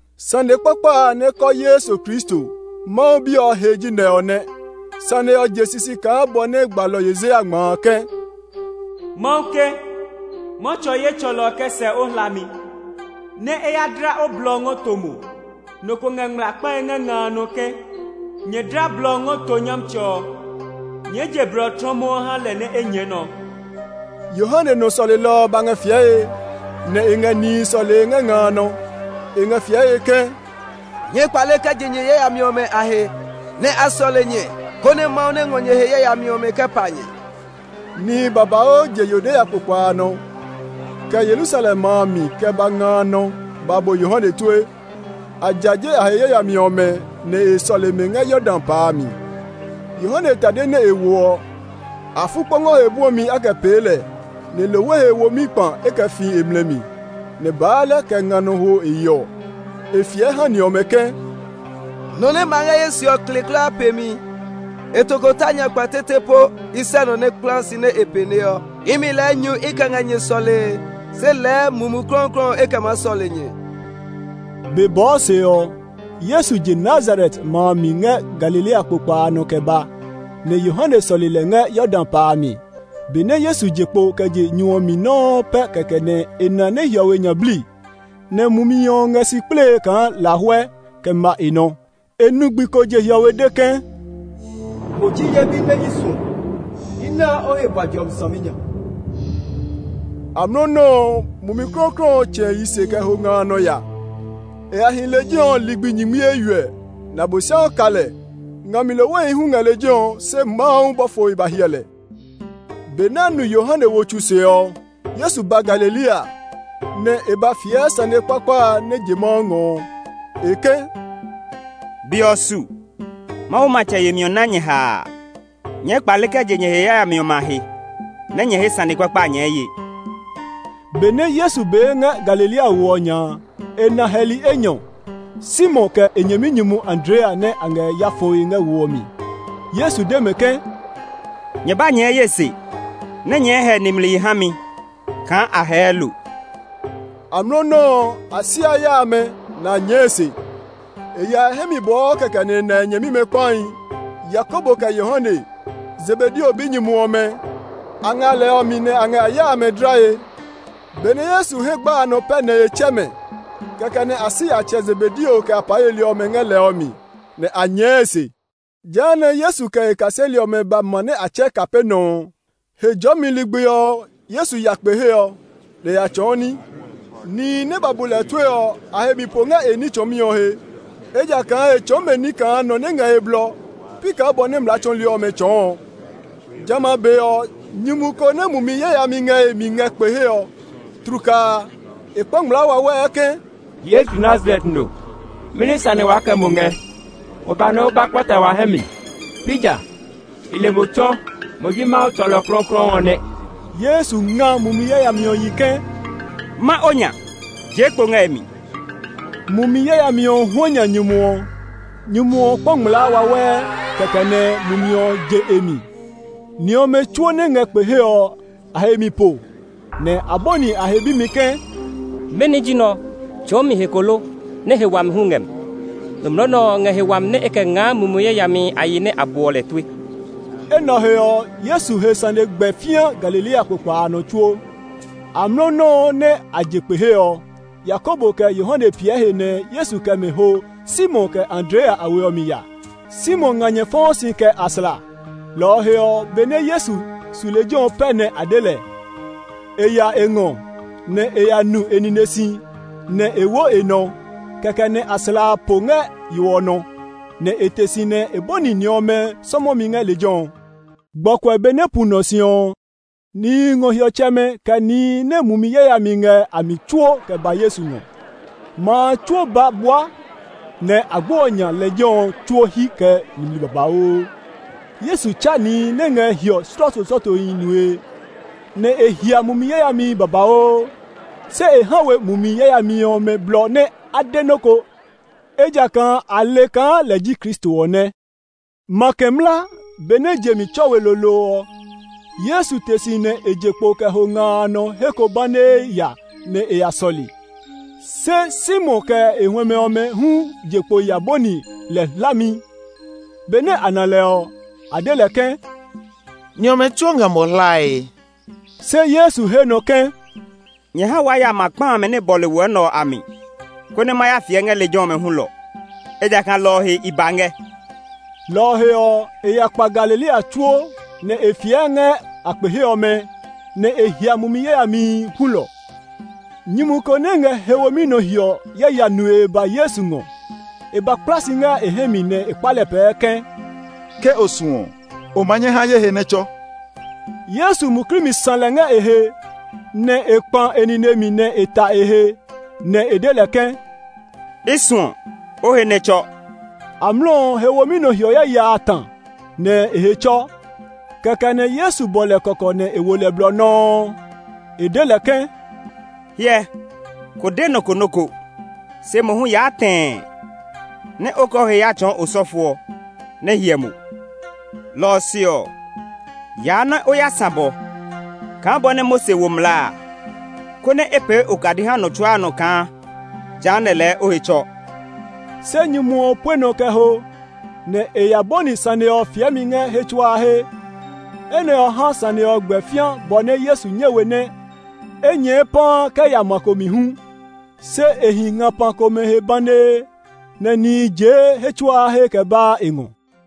Sane kpakpa a nɛ kɔɔ Yesu Kristo, Mawu Bi ɔ he ji nɛ ɔ nɛ. Sane ɔ je sisi kaa bɔ nɛ gbalɔ Yesaya ngma a ke, “Mawu ke, ‘Ma tsɔ ye tsɔlɔ kɛ sɛ o hlami nɛ e ya dla o blɔ ɔ ngɔ to mo.’ Nɔ ko ngɛ ngmlaa kpae ngɛ nga a nɔ ke, ‘Nyɛ dla blɔ ngɔ to Nyɔmtsɛ ɔ; nyɛɛ je blɔ tlɔmɔɔ ha lɛ nɛ e nyɛɛ nɔ!’” Yohane nɔ sɔlelɔ ɔ ba ngɛ fiɛe nɛ e ngɛ nihi sɔlee ngɛ nga a nɔ. E ngɛ fiɛe ke, “Nyɛɛ kpale kɛ je nyɛ yayami ɔmɛ a he, nɛ́ a sɔle nyɛ konɛ Mawu nɛ ngɔ nyɛ he yayami ɔmɛ kɛ pa nyɛ.” Nihi babauu je Yudea kpokpa a nɔ, kɛ Yerusalem ma a mi kɛ ba nga a nɔ ba bu Yohane tue. A jaje a he yayami ɔmɛ, nɛ a sɔle mɛ ngɛ Yordan pa a mi. Yohane tade nɛ e woɔ ɔ, afukpɔngɔ he bwɔmi a kɛ pee ɛ; nɛ lohwe he womi kpa e kɛ fii e mlɛ mi, nɛ baalɛ kɛ nga nɔ hwo e yeɔ. E fiɛ ha ni ɔmɛ ke, “Nɔ nɛ ma ngɛ ye se ɔ kle kulaa pe mi; e tokota nya kpa tete po i sɛ nɔ nɛ kplaa si nɛ e pɛneɔ. Imi lɛɛ nyu i kɛ ngɛ nyɛ sɔlee, se lɛɛ Mumi Klɔuklɔu e kɛ maa sɔle nyɛ.” Be bɔɔ se ɔ, Yesu je Nazaret ma a mi ngɛ Galilea kpokpa a nɔ kɛ ba, nɛ Yohane sɔle lɛ ngɛ Yordan pa a mi. Benɛ Yesu je kpo kɛ je nyu ɔ mi nɔuu pɛ kɛkɛ nɛ e na nɛ hiɔwe nya bli, nɛ Mumi ɔ ngɛ si kplee kaa lahuɛ kɛ ma e nɔ. E nu gbi ko je hiɔwe de ke, “Mo ji ye bi nɛ i suɔ; i naa o he bua jɔmi saminya.” Amlɔ nɔuu ɔ, Mumi Klɔuklɔu ɔ tsɛ̃ e yi se kɛ ho nga a nɔ ya. E ya hi lejɛ ɔ ligbi nyingmi eywiɛ, nɛ Abosiami ka lɛ; nga mi lohwehi hu ngɛ lejɛ ɔ, se Mawu bɔfohi ba hyɛ lɛ. Benɛ a nu Yohane wo tsu se ɔ, Yesu ba Galilea, nɛ e ba fiɛ sane kpakpa a nɛ je Mawu ngɔ ɔ. E ke, “Be ɔ su; Mawu matsɛ yemi ɔ ná nyɛ haa! Nyɛɛ kpale kɛ je nyɛ he yayami ɔmɛ a he, nɛ nyɛ he sane kpakpa a nyɛɛ ye.” Benɛ Yesu bee ngɛ Galilea wo ɔ nya a, e na hɛli enyɔ, Simon kɛ e nyɛminyumu Andrea nɛ a ngɛ ya fɔe ngɛ wo ɔ mi. Yesu de mɛ ke, “Nyɛ ba nyɛɛ ye se nɛ nyɛɛ hɛ nimli ha mi kaa a hɛɛ lo.” Amlɔ nɔuu ɔ, a si a ya amɛ, nɛ a nyɛɛ e se. E ya e hɛ mi bɔɔ kɛkɛ nɛ e na nyɛmimɛ kpahi, Yakobo kɛ Yohane, Zebedeo binyumu ɔmɛ. A ngɛ a lɛ ɔ mi nɛ a ngɛ a ya amɛ dlae. Benɛ Yesu hɛ gba a nɔ pɛ nɛ e tsɛ mɛ; kɛkɛ nɛ a si a tsɛ Zebedeo kɛ apaa yeli ɔmɛ ngɛ lɛ ɔ mi, nɛ a nyɛɛ e se. Jehanɛ Yesu kɛ e kaseli ɔmɛ ba ma nɛ a tsɛɛ Kapernaum ɔ. Hejɔɔmi ligbi ɔ, Yesu ya kpe he ɔ, nɛ e ya tsɔɔ ní. Nihi nɛ ba bu lɛ tue ɔ, a he mi po ngɛ e ní tsɔɔmi ɔ he, ejakaa e tsɔɔ mɛ ní kaa nɔ nɛ ngɛ he blɔ, pi kaa bɔ nɛ mlaa tsɔɔli ɔmɛ tsɔɔ ɔ. Jamɛ a be ɔ, nyumu ko nɛ mumi yayami ngɛ e mi ngɛ kpe he ɔ. Tlukaa, e kpa ngmlaa wawɛɛ ke, “Yesu Nazaret no, mɛni sane waa kɛ mo ngɛ? O ba nɛ o ba kpata wa hɛ mi; pi ja? I le mo tsɔ! Mo ji Mawu tsɔlɔ klɔuklɔu ɔ nɛ.” Yesu nga mumi yayami ɔ yi ke, “Ma o nya! Jee kpo ngɛ e ɔ mi.” Mumi yayami ɔ huanya nyumu ɔ; nyumu ɔ kpa ngmlaa wawɛɛ, kɛkɛ nɛ mumi ɔ je e mi. Ni ɔmɛ tsuo nɛ ngɛ kpe he ɔ, a he mi po, nɛ a bɔni a he bimi ke, “Mɛni ji nɛ ɔ? Tsɔɔmi he ko lo? Nɛ he wumi hu ngɛ mi. Nɔmlɔ nɛ ɔ ngɛ he wami nɛ e kɛ ngaa mumi yayamihi a yi nɛ a buɔ lɛ tue!” Enɛ ɔ he ɔ, Yesu he sane gbɛ fĩa Galilea kpokpa a tsuo nɔ. Amlɔ nɔuu nɛ a je kpe he ɔ, Yakobo kɛ Yohane piɛ he nɛ Yesu kɛ mɛ ho Simon kɛ Andrea a we ɔ mi ya. Simon nganyɛ fɔɔ si kɛ aslã; lɔ ɔ he ɔ, benɛ Yesu su lejɛ ɔ pɛ nɛ a de lɛ. E ya e ngɔ, nɛ e ya nu e nine si, nɛ e wo e nɔ; kɛkɛ nɛ aslã a po ngɛ yo ɔ nɔ, nɛ e te si nɛ e bɔni ni ɔmɛ sɔmɔmi ngɛ lejɛ ɔ. Gbɔkuɛ benɛ pu nɔ si ɔ, nihi ngɔ hiɔtsɛmɛ kɛ nihi nɛ mumi yayami ngɛ a mi tsuo kɛ ba Yesu ngɔ. Ma a tsuo ba bua, nɛ agbo ɔ nya lejɛ ɔ tsuo hyi kɛ nimli babauu. Yesu tsa nihi nɛ ngɛ hiɔ slɔɔtoslɔɔtohi nue, nɛ e hia mumi yayamihi babauu. Se e ha we mumi yayami ɔmɛ blɔ nɛ a de nɔ́ ko, ejakaa a le kaa lɛ ji Kristo ɔ nɛ. Makɛ mla, benɛ je mi tsɔ we lolo ɔ, Yesu te si nɛ e je kpo kɛ ho nga a nɔ he ko banee ya nɛ e ya sɔle. Se Simon kɛ e huɛmɛ ɔmɛ hu je kpo ya bɔni lɛ hlami. Benɛ a na lɛ ɔ, a de lɛ ke, “Ni ɔmɛ tsuo ngɛ mo hlae.” Se Yesu he nɔ ke, “Nyɛ ha waa ya ma kpa amɛ nɛ bɔle wɔ nɛ ɔ a mi, konɛ ma ya fiɛ ngɛ lejɛ ɔmɛ hulɔ; ejakaa lɔ ɔ he i ba ngɛ.” Lɔ ɔ he ɔ, e ya kpa Galilea tsuo, nɛ e fiɛ ngɛ a kpe he ɔmɛ, nɛ e hia mumi yayamihi hulɔ. Nyumu ko nɛ ngɛ he womi nɔ hiɔ yaya nue ba Yesu ngɔ. E ba kpla si ngɛ e hɛ mi nɛ e kpa lɛ pɛɛ ke, “Ke o suɔ ɔ, o ma nyɛ ha ye he nɛ tsɔ!” Yesu muklii mi sã lɛ ngɛ e he, nɛ e kpã e nine mi nɛ e ta e he, nɛ e de lɛ ke, “I suɔ! O he nɛ tsɔ!” Amlɔ ɔ, he womi nɔ hiɔ yaya a ta, nɛ e he tsɔ. Kɛkɛ nɛ Yesu bɔ lɛ kɔkɔ nɛ e wo lɛ blɔ nɔuu. E de lɛ ke, “Hyɛ, ko de nɔ ko nɔ́ ko, se mohu yaa tɛɛ nɛ o kɛ o he ya tsɔɔ osɔfo ɔ, nɛ e hyɛ mo. Lɔ ɔ se ɔ, yaa nɛ o ya sã bɔ kaa bɔ nɛ Mose wo mlaa a, konɛ e pee okadi ha nɔ tsuaa nɔ kaa jehanɛ lɛɛ o he tsɔ.” Se nyumu ɔ pue nɔ kɛ ho, nɛ e ya bɔni sane ɔ fiɛmi ngɛ he tsuaa he. Enɛ ɔ ha sane ɔ gbɛ fĩa bɔ nɛ Yesu nyɛ we nɛ e nyɛɛ paa kɛ ya ma ko mi hu; se e hi ngapa he komɛ banee, nɛ nihi jee he tsuaa he kɛ baa e ngɔ.